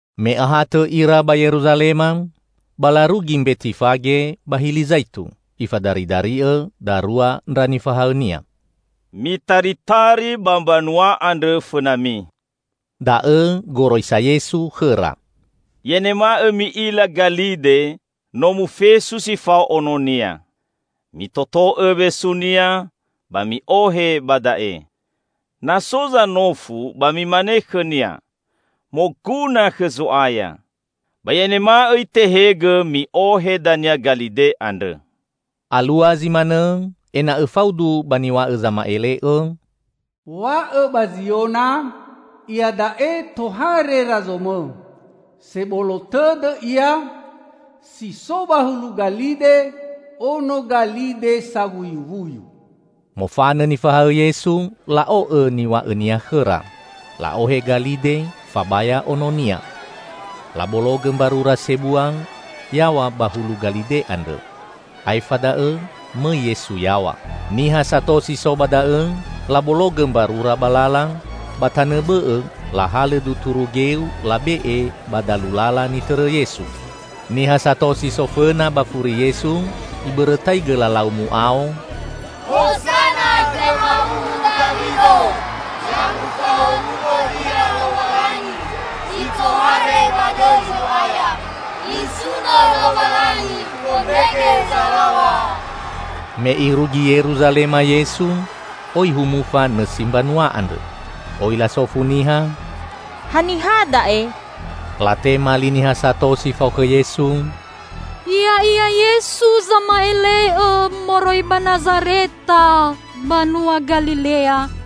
Me ahatõ ira ba Yeruzalema, ba larugi Mbetifage ba Hili Zaitu. Ifadaridari'õ darua ndra nifahaõ-Nia. "Mitaritari ba mbanua andrõ fõnami," da'õ goroisa Yesu khõra. "I'anema'õ mi'ila galide, no mufesu si fao ononia. Mitoto'õ wesunia ba mi'ohe ba da'e. Na so zanofu, ba mimane khõnia, 'Moguna khõ Zo'aya', ba i'anema'õ itehegõ mi'ohe dania galide andrõ." Alua zi manõ ena'õ faudu ba niw̃a'õ zama'ele'õ, "&Wa'õ ba Ziona, iada'e tohare Razomõ. Sebolo tõdõ Ia, si so ba hulu galide, ono galide sawuyuwuyu." Mofanõ nifahaõ Yesu, la'o'õ niw̃a'õ-Nia khõra. La'ohe galide fabaya ononia. Labologõ mbarura sebua yaw̃a ba hulu galide andrõ. Aefa da'õ mõi Yesu yaw̃a. Niha sato si so ba da'õ labologõ mbarura ba lala, ba tanõ bõ'õ lahalõ duturu geu labe'e ba dalu lala nitõrõ Yesu. Niha sato si so fõna ba furi Yesu ibõrõtaigõ lalau mu'ao, "Hozana khõ ma'uwu Dawido! Ya mufahowu'õ Ia Lowalangi zi tohare ba dõi Zo'aya! Nisuno Lowalangi Fondrege Zalaw̃a!" Me irugi Yeruzalema Yesu, oi humufa nõsi mbanua andrõ. Oi lasofu niha, "Haniha da'e?" Latema li niha sato si fao khõ Yesu, "Ya'ia Yesu Sama'ele'õ, moroi ba Nazareta, banua Galilea."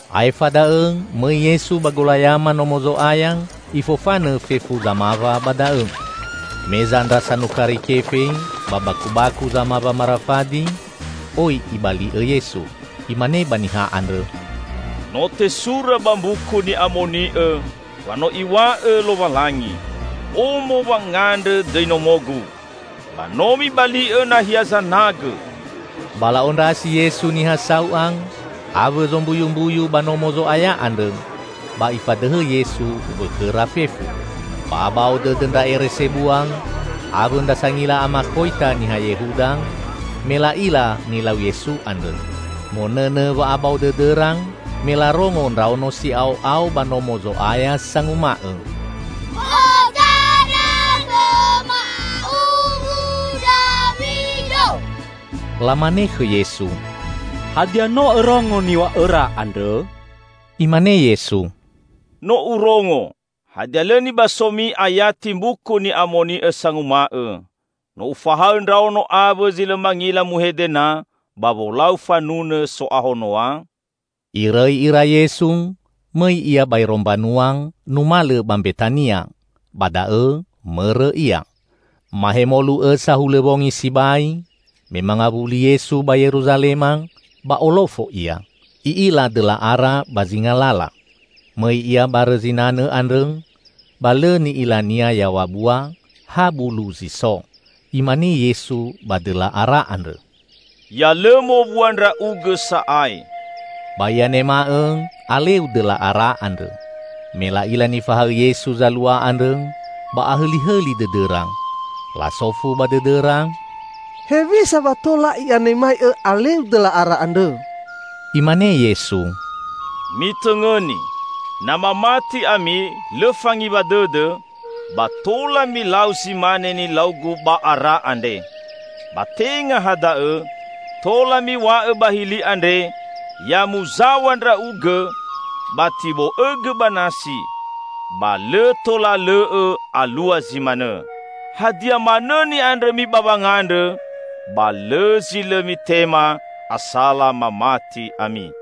Aefa da'õ mõi Yesu ba golayama Nomo Zo'aya, Ifofanõ fefu zamawa ba da'õ. Meza ndra sanukari kefe ba bakubaku zamawa marafadi, oi Ibali'õ Yesu. Imane ba niha andrõ, "No tesura ba Mbuku Ni'amoni'õ wa no Iw̃a'õ Lowalangi, 'Omo wangandrõ dõi nomo-Gu.' Ba no mibali'õ nahia zanagõ!" Ba la'ondrasi Yesu niha sau'a awõ zombuyumbuyu ba Nomo Zo'aya andrõ, ba Ifadõhõ Yesu wõkhõra fefu. Ba abao dõdõ ndra ere sebua awõ ndra sangila amakhoita niha Yehuda me la'ila nilau Yesu andrõ. Monõnõ wa'abao dõdõra me larongo ndraono si'ao'ao ba Nomo Zo'aya sanguma'õ, "Hozana khõ ma'uwu Dawido!" Lamane khõ Yesu, "Hadia no Õrongo niw̃a'õra andrõ?" Imane Yesu, "No Urongo! Hadia lõ nibasomi ayati Mbuku Ni'amoni'õ sanguma'õ, 'No Ufahaõ ndraono awõ zi lõ mangila muhede na ba wolau fanunõ so'ahono'a'?" Irõi ira Yesu, mõi Ia baero mbanua, numalõ ba Mbetania. Ba da'õ mõrõ Ia. Mahemolu õ sahulõ wongi sibai, me mangawuli Yesu ba Yeruzalema, ba olofo Ia. I'ila dõla ara ba zinga lala. Mõi Ia barõ zinanõ andrõ, ba lõ ni'ila-Nia yaw̃a bua, ha bulu zi so. Imane Yesu ba dõla ara andrõ, "Ya lõ mowua ndra'ugõ sa'ae!" Ba i'anema'õ aleu dõla ara andrõ. Me la'ila nifahaõ Yesu zalua andrõ, ba ahõlihõli dõdõra. Lasofu ba dõdõra, "Hewisa wa tola i'anema'õ aleu dõla ara andrõ." Imane Yesu, "Mitõngõni. Na mamati ami, lõ fangiwa dõdõ, ba tola milau zi mane nilau-Gu ba ara andre. Ba tenga ha da'õ, tola miw̃a'õ ba hili andre, 'Ya muzaw̃a ndra'ugõ, ba tibo'õgõ ba nasi'; ba lõ tola lõ'õ alua zi manõ. Hadia manõ ni'andrõmi ba wangandrõ, ba lõ zi lõ mitema asala mamati ami."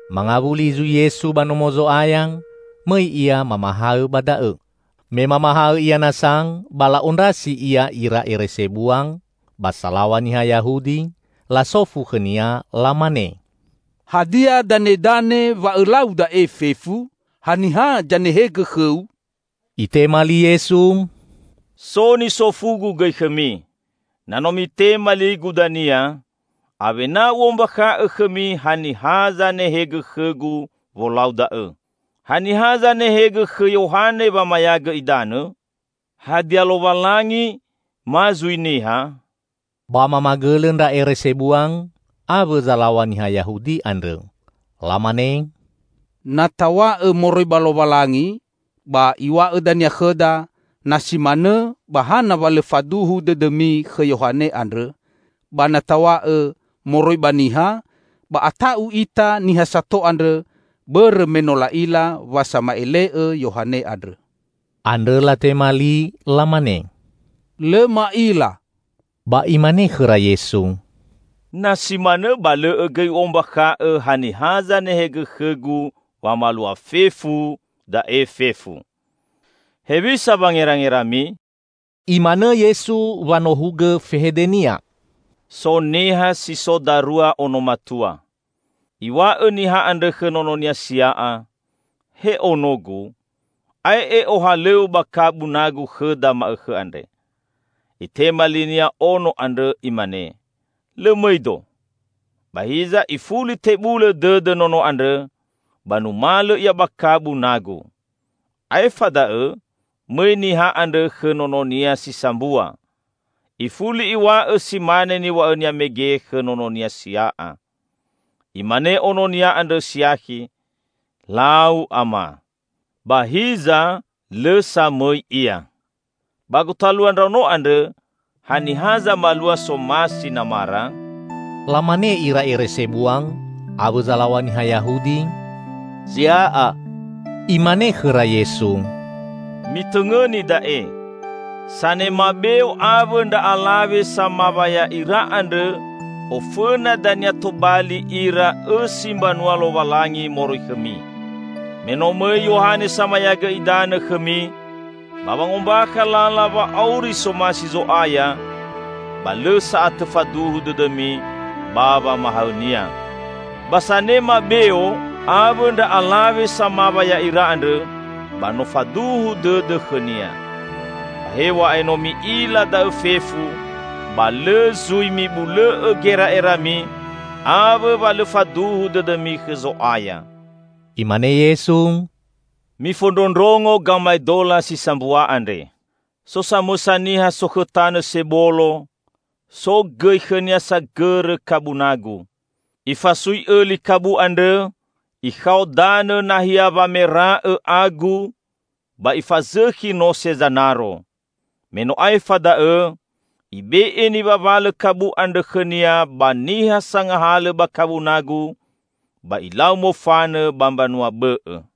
Mangawuli zui Yesu ba Nomo Zo'aya, mõi Ia mamahaõ ba da'õ. Me mamahaõ Ia nasa ba la'ondrasi Ia ira ere sebua ba salaw̃a niha Yahudi, lasofu khõ-Nia, lamane, "Hadia danedane wa Õlau da'e fefu? Haniha zanehegõ khõ-U?" Itema li Yesu, "So nisofu-Gu gõi khõmi. Na no mitema li-Gu dania, awena U'ombakha'õ khõmi haniha zanehegõ khõ-Gu wolau da'õ. Haniha zanehegõ khõ Yohane wamayagõ idanõ? Hadia Lowalangi ma zui niha?" Ba mamagõlõ ndra ere sebua awõ zalaw̃a niha Yahudi andrõ. Lamane, "Na taw̃a'õ moroi ba Lowalangi, ba Iw̃a'õ dania khõda, 'Na si manõ ba hana wa lõ faduhu dõdõmi khõ Yohane andrõ?' Ba na taw̃a'õ, 'Moroi ba niha,' ba ata'u ita niha sato andrõ, bõrõ me no la'ila wa sama'ele'õ Yohane andrõ." Andrõ latema li lamane, "Lõ ma'ila." Ba Imane khõra Yesu, "Na si manõ ba lõ'õ gõi U'ombakha'õ haniha zanehegõ khõ-Gu wamalua fefu da'e fefu." "Hewisa wangerangerami?" Imanõ Yesu wanohugõ fehede-Nia. "So niha si so darua ono matua. Iw̃a'õ niha andrõ khõ nononia sia'a, 'He onogu, ae'e ohalõw̃õ ba kabu nagu khõda ma'õkhõ andre.' Itema linia ono andrõ imane, 'Lõ mõido,' ba hiza ifuli tebulõ dõdõ nono andrõ ba numalõ ia ba kabu nagu. Aefa da'õ mõi niha andrõ khõ nononia si sambua, ifuli iw̃a'õ si mane niw̃a'õnia mege khõ nononia sia'a. Imane ononia andrõ siakhi, 'Lau, Ama,' ba hiza lõ sa mõi ia. Ba gotalua ndraono andrõ, haniha zamalua somasi namara?" Lamane ira ere sebua awõ zalaw̃a niha Yahudi, "Sia'a!" Imane khõra Yesu, "Mitõngõni da'e: Sanema beo awõ ndra alawe samawa ya'ira andrõ ofõna dania tobali ira õsi mbanua Lowalangi moroi khõmi. Me no mõi Yohane Samayagõ Idanõ khõmi, ba wangombakha lala wa'auri somasi Zo'aya, ba lõ sa'atõ faduhu dõdõmi ba wamahaõ-Nia; ba sanema beo awõ ndra alawe samawa ya'ira andrõ, ba no faduhu dõdõ khõnia. Ba hew̃a'ae no mi'ila da'õ fefu, ba lõ zui mibulõ'õ gera'erami awõ wa lõ faduhu dõdõmi khõ Zo'aya." Imane Yesu, "Mifondrondrongo gamaedola si sambua andre. So samõsa niha sokhõ tanõ sebolo, so gõi khõnia sagõrõ kabu nagu. Ifasui õli kabu andrõ, ikhao danõ nahia wamera'õ agu, ba ifazõkhi nose zanaro. Me no aefa da'õ, ibe'e niwawalõ kabu andrõ khõnia ba niha sangahalõ ba kabu nagu, ba ilau mofanõ ba mbanua bõ'õ.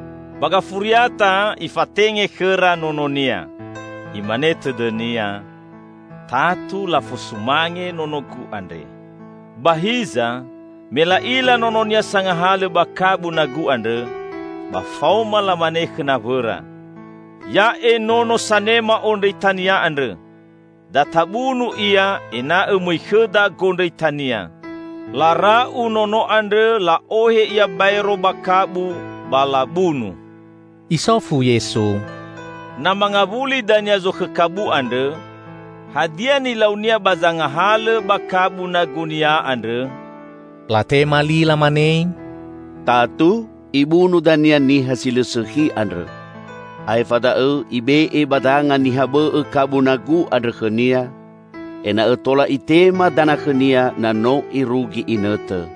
Ba gafuriata, ifatenge khõra nononia. Imane tõdõnia, 'Tatu lafosumange nonogu andre.' Ba hiza, me la'ila nononia sangahalõ ba kabu nagu andrõ, ba faoma lamane khõ nawõra, 'Ya'e nono sanema ondrõitania andrõ. Da tabunu ia ena'õ mõi khõda gondrõitania!' Lara'u nono andrõ la'ohe ia baero ba kabu ba labunu." Isofu Yesu, "Na mangawuli dania zokhõ kabu andrõ, hadia nilaunia ba zangahalõ ba kabu nagunia andrõ?" Latema li lamane, "Tatu, ibunu dania niha si lõ sõkhi andrõ. Aefa da'õ ibe'e ba danga niha bõ'õ kabu nagu andrõ khõnia ena'õ tola itema dana khõnia na no irugi inõtõ."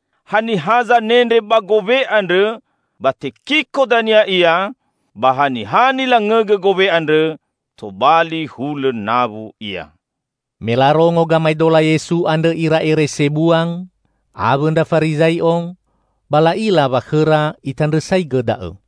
[Haniha zanendre ba gowe andrõ, ba tekiko dania ia; ba haniha nilangõgõ gowe andrõ, tobali hulõ nawu ia.]" Me larongo gamaedola Yesu andrõ ira ere sebua awõ ndra Farizai'o, ba la'ila wa khõra Itandrõsaigõ da'õ.